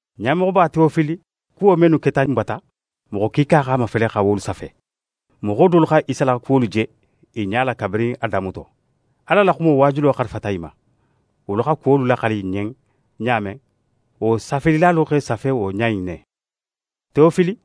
Ɲamoxoba Tewofili, kuwo mennu keta n bata, moxo kiika x'a mafele xa wolu safe. Moxo dolu xa Isa la kuwolu je i ɲa la kabirin a damuto. Ala la xumo waajulo xarifata i ma. Wolu xa kuwolu laxali n ɲen ɲa men, wo safelilalu x'e safe wo ɲa in ne. Tewofili,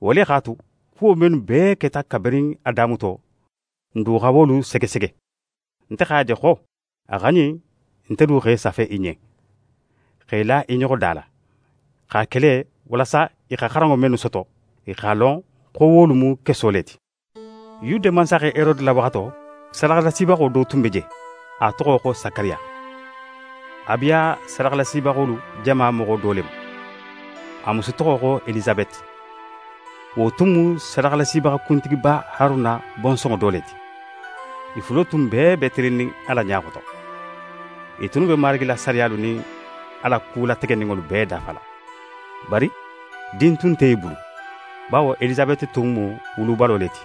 wo le x'a tu, kuwo mennu bee keta kabirin a damuto, ń du xa wolu segesege. Nte x'a je xo a xa ɲin nte du x'e safe í ɲen, x'e la i ɲoxo da la. Ń x'a ke le walasa í xa xaranŋo mennu soto, í x'a lon xo wolu mu keso le ti. Yude mansaxe Herode la waxato, sadaxalasibaxo do tun be je, a toxo xo Sakariya. Abiya sadaxalasibaxolu jama moxo do le mu. A musu toxo xo Elisabeti. Wo tun mu sadaxalasibaxa kuntigiba Haruna bonsonŋo do le ti. I fulo tun bee be tilinnin Ala ɲa xoto. I tunnu be Marigi la sariyalu nin a la ku lategeninŋolu bee dafala. Bari din tun nte i bulu, bawo Elisabeti tun mu wulubalo le ti,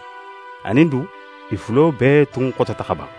anin du i fulo bee tun xotota xa ban.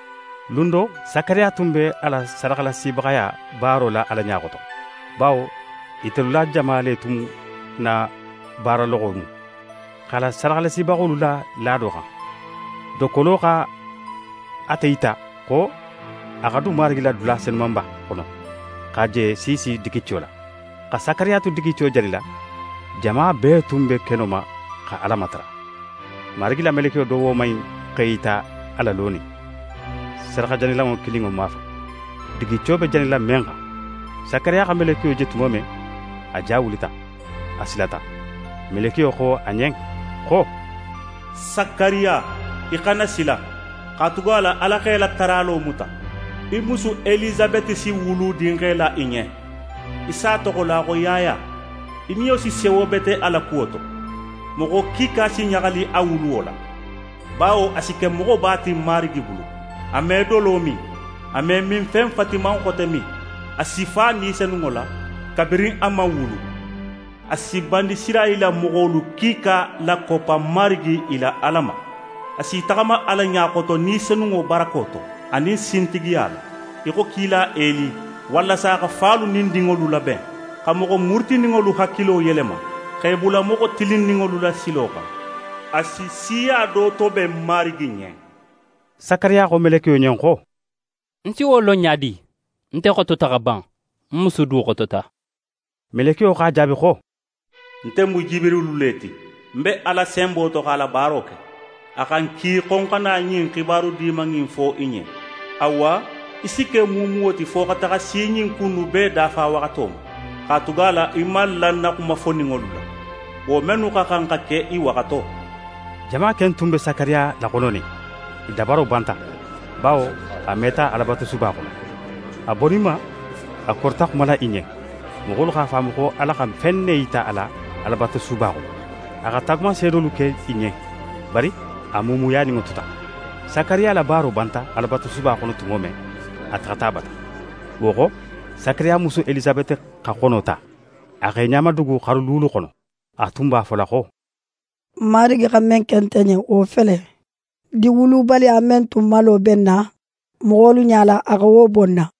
Lun do, Sakariya tun be a la sadaxalasibaxaya baaro la Ala ɲa xoto, bawo itelu la jama le tun na baaraloxo mu. X'a la sadaxalasibaxolu la laado xan, dokkolo xa ate yita xo a xa dun Marigi la dula Senumanba xono, xa je siisi digico la. Xa Sakariya tu digico janila, jama bee tun be keno ma xa Ala matara. Marigi la melekiyo do woman in x'é yita a la lonin sadaxajanilanŋo kininŋo mafan, digico be janila men xan. Sakariya xa melekiyo je tumo men, a ja wulita, a silata. Melekiyo xo a ɲen xo: «Sakariya, í xana sila; katugala Ala x'é la taralo muta. Í musu Elisabeti si wulu dinxe la í ɲen, í s'a toxola xo Yaya. Í niyo si sewo bete a la kuwo to, moxo kiika si ɲaxali a wuluwo la, bawo a si ke moxoba ti Marigi bulu. A me dolo min, a me minfen fatiman xote min. A si fa Ni Senunŋo la kabirin a man wulu. A si Banisirayila moxolu kiika lakoppa Marigi i la Ala ma. A s'í taxama Ala ɲa xoto Ni Senunŋo barako to anin sintigiya la, í xo kila Eli, walasa xa falu nin dinŋolu laben, xa moxo murutininŋolu hakilo yelema x'e bula moxo tilinninŋolu la silo xan. A si siya do toben Marigi ɲen.» Sakariya xo melekiyo ɲen xo: «Ń si wo lon ɲa di? Nte xotota xa ban, ń musu du xotota?» Melekiyo x'a jaabi xo: «Nte mu Jibirilu le ti, ń be Ala senbo to x'a la baaro ke. A xa ń ki xo ń xa na ɲin xibaru diman in fo í ɲen. Awa, í si ke muumuwo ti fo xa taxa si ɲin ku innu bee dafawaxato ma, katugala í man la ń na xuma foninŋolu la, wo mennu xa xan xa ke i waxato.» Jama ken tun be Sakariya laxononin. I dabaro banta, bawo a meta Alabatusuba xono. A boninma, a korita xumala i ɲen; moxolu x'a faamu xo Ala xa fen ne yita a la Alabatusuba xono. A xa taagumanseedolu ke i ɲen, bari a muumuyaninŋo tuta. Sakariya la baaro banta Alabatusuba xono tumo men, a taxata a bata. Wo xo, Sakariya musu Elisabeti xa xono ta, a x'é ɲamadugu xaru luulu xono. A tun b'a fola xo: «Marigi xa men ke nte ɲen, wo fele: Din wulubaliya men tun malo be ń na, moxolu ɲala, a xa wo bo ń na.»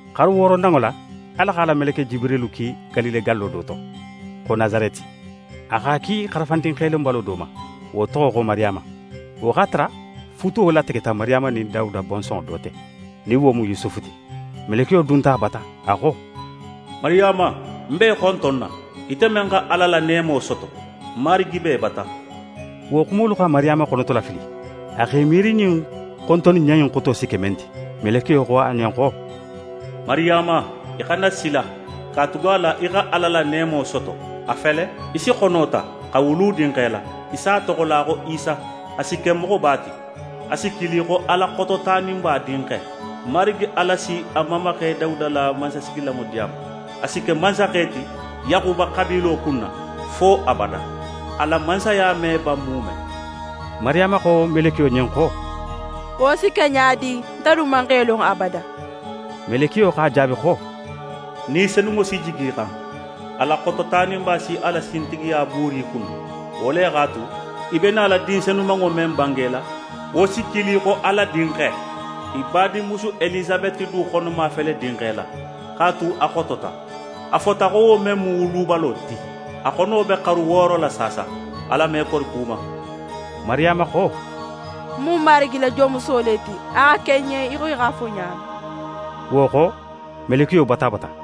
Xaru wooronanŋo la, Ala x'a la meleke Jibirilu ki Galile gallo do to, xo Nasareti. A x'a ki xarafandin xelonbalo do ma, wo toxo xo Mariyama. Wo x'a tara futuwo lategeta Mariyama nin Dawuda bonsonŋo do te, nin wo mu Yusufu ti. Melekiyo dunta a bata, a xo: «Mariyama, ń b'é xontonna, ite men xa Ala la neemo soto. Marigi be í bata.» Wo xumolu xa Mariyama xonotolafili. A x'é miiri ɲin xontonniɲa in xoto si ke men ti. Melekiyo xo a ɲen xo: «Mariyama, í xana sila, katugala í xa Ala la neemo soto. A fele, í si xono ta, xa wulu dinxe la. Í si a toxola xo Isa. A si ke moxoba ti. A si kili xo Ala Xototaninba Dinxe. Marigi Ala si a mamaxe Dawuda la mansasigilanŋo di a ma. A si ke mansaxe ti Yaxuba xabiilo kunna fo abada. A la mansaya me ban muume.» Mariyama xo melekiyo ɲen xo: «Wo si ke ɲa di, nte dun man xe lon abada?» Melekiyo x'a jaabi xo: «Ni Senunŋo si jigi í xan, Ala Xototaninba si a la sintigiya buuri í kunna. Wo le x'a tu, í be nala din senumanŋo men bangela, wo si kili xo Ala Dinxe. Í badinmusu Elisabeti du xonoma fele dinxe la, x'a tu a xotota. A fota xo wo men mu wulubalo ti, a xono be xaru wooro la saasa. Ala me kori ku ma.» Mariyama xo: «Ń mu Marigi la jonmuso le ti. A xa ke ń ɲen í xo í x'a fo ɲa men.» Wo xo, melekiyo bota a bata.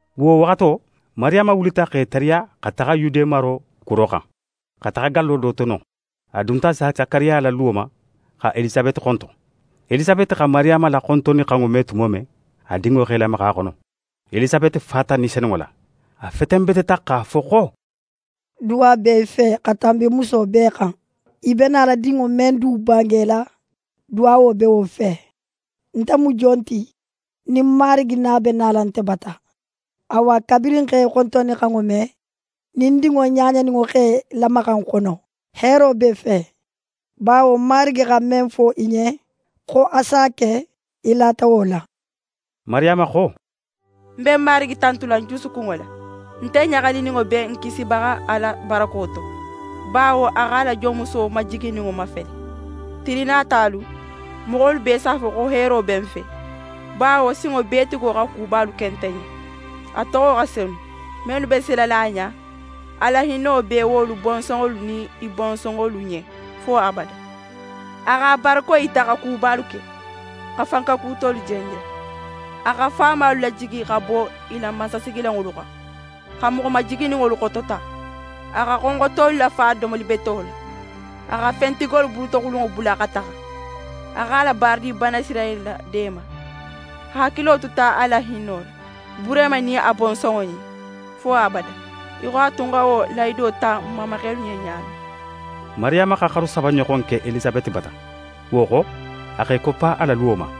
Wo waxato, Mariyama wulita x'é tariya xa taxa Yude maro kuro xan, xa taxa gallo do to non. A dunta Sakariya la luwo ma xa Elisabeti xonton. Elisabeti xa Mariyama la xontonnixanŋo me tumo men, a dinŋo x'é lamaxa a xono. Elisabeti fata Ni Senunŋo la. A fetenbeteta x'a fo xo: «Duwa be í fe xa tanbi muso bee xan; í be nala dinŋo men du bangela, duwawo be wo fe. Nte mu jon ti nin ń Marigi na be nala nte bata? Awa, kabirin ń x'é xontonnixanŋo me, nin ń dinŋo ɲaɲaninŋo x'é lamaxa ń xono. Heero b'é fe, bawo Marigi xa men fo í ɲen, xo a s'a ke, í lata wo la.» Mariyama xo: «Ń be Marigi tantula ń jusukunŋo la. Nte ɲaxalininŋo be ń Kisibaxa Ala barako to, bawo a x'a la jonmuso majigininŋo mafele. Tili natalu, moxolu bee s'a fo xo heero be ń fe; bawo Sinŋobeetigo xa kubalu ke nte ɲen. A toxo xa senu. Mennu be silala a ɲa, a la hinno be wolu bonsonŋolu nin i bonsonŋolu ɲen, fo abada. A x'a barako yita xa kubalu ke, xa fankekutolu jenjen. A xa faamalu lajigi xa bo i la mansasigilanŋolu xan, xa moxo majigininŋolu xotota. A xa xonxotolu lafa domoli beto la; a xa fentigolu bulutoxulunŋo bula xa taxa. A x'a la baaradin Banisirayila deema: A hakilo tuta a la hinno la Burehima nin a bonsonŋo ɲen, fo abada, í xo a tun xa wo lahido ta n mamaxelu ɲen ɲa men.» Mariyama xa xaru saba ɲoxon ke Elisabeti bata. Wo xo, a x'é koppa a la luwo ma.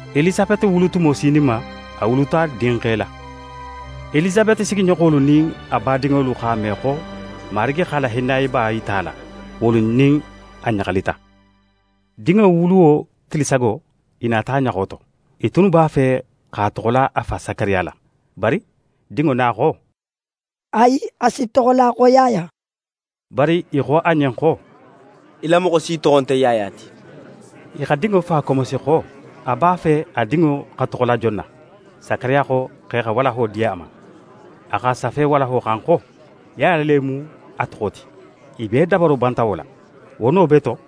Elisabeti wulutumo sininma, a wuluta dinxe la. Elisabeti sigiɲoxolu nin a badinŋolu x'a me xo Marigi x'a la hinnayeba yita a la, wolu nin a ɲaxalita. Dinŋo wuluwo tili sago, i nata a ɲaxo to. I tunnu b'a fe x'a toxola a fa Sakariya la, bari dinŋo na xo: «Ayi, a si toxola xo Yaya.» Bari i xo a ɲen xo: «Í la moxo si toxo nte Yaya ti.» I xa dinŋo fa komosi xo a b'a fe a dinŋo xa toxola jon na. Sakariya xo x'e xa walaho di a ma. A x'a safe walaho xan xo: «Yaya le mu a toxo ti.» I bee dabaro banta wo la. Wo no bee to,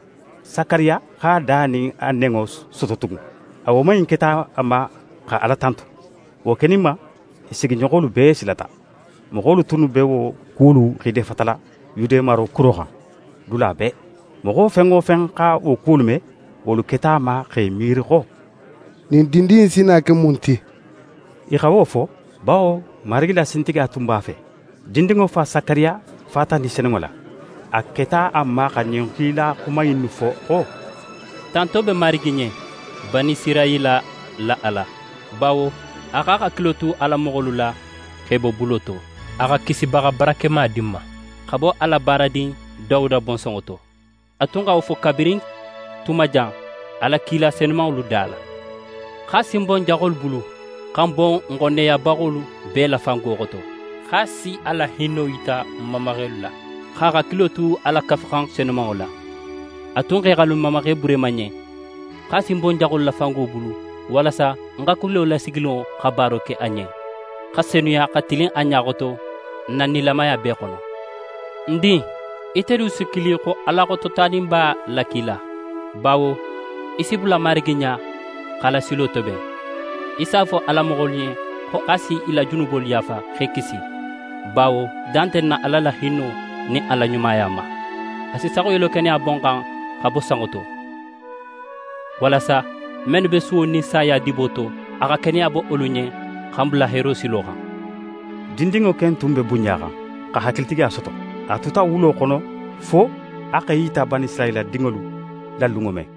Sakariya x'a da nin a nenŋo soto tugun. A woman in keta a ma xa Ala tantu. Wo keninma, i sigiɲoxolu bee silata. Moxolu tunnu be wo kuwolu xiidefatala Yude maro kuro xan, dula bee. Moxo fen wo fen xa wo kuwolu me, wolu keta a ma x'e miiri xo: «Ɲin dindin in si na ke mun ti?» I xa wo fo, bawo Marigi la sintigiya tun b'a fe. Dindinŋo fa Sakariya fata Ni Senunŋo la. A keta a ma xa ɲin kilaya xuma innu fo xo: «Tanto be Marigi ɲen, Banisirayila la Ala, bawo a x'a hakilo tu a la moxolu la, x'e bo bulo to. A xa kisibaxa barakema di n ma, xa bo a la baaradin Dawuda bonsonŋo to. A tun xa wo fo kabirin tuma jan a la kila senumanŋolu da la, x'a si n bo n jaxolu bulu, xa n bo n xonneyabaxolu bee la fango xoto; x'a si a la hinno yita n mamaxelu la, x'a hakilo tu a la Kafuxan senumanŋo la. A tun x'é xali n mamaxe Burehima ɲen, x'a si n bo n jaxolu la fango bulu, walasa n hakilo lasigininŋo xa baaro ke a ɲen, xa senuya, xa tilin a ɲa xoto n na nilamaya bee xono. Ń din, ite du si kili xo Ala Xototaninba la kila, bawo í si bula Marigi ɲa, x'a la silo toben. Í s'a fo a la moxolu ɲen xo a s'i la junubolu yaafa, x'e kisi. Bawo dan nte n na Ala la hinno nin a la ɲumaya ma; a si saxuyelo keneya bo n xan xa bo sanŋo to, walasa mennu be suwo nin saya dibo to, a xa keneya bo wolu ɲen, xa n bula heero silo xan.» Dindinŋo ken tun be bunɲaxan, xa hakilitigiya soto. A tuta wulo xono fo a x'é yita Banisirayila dinŋolu la lunŋo men.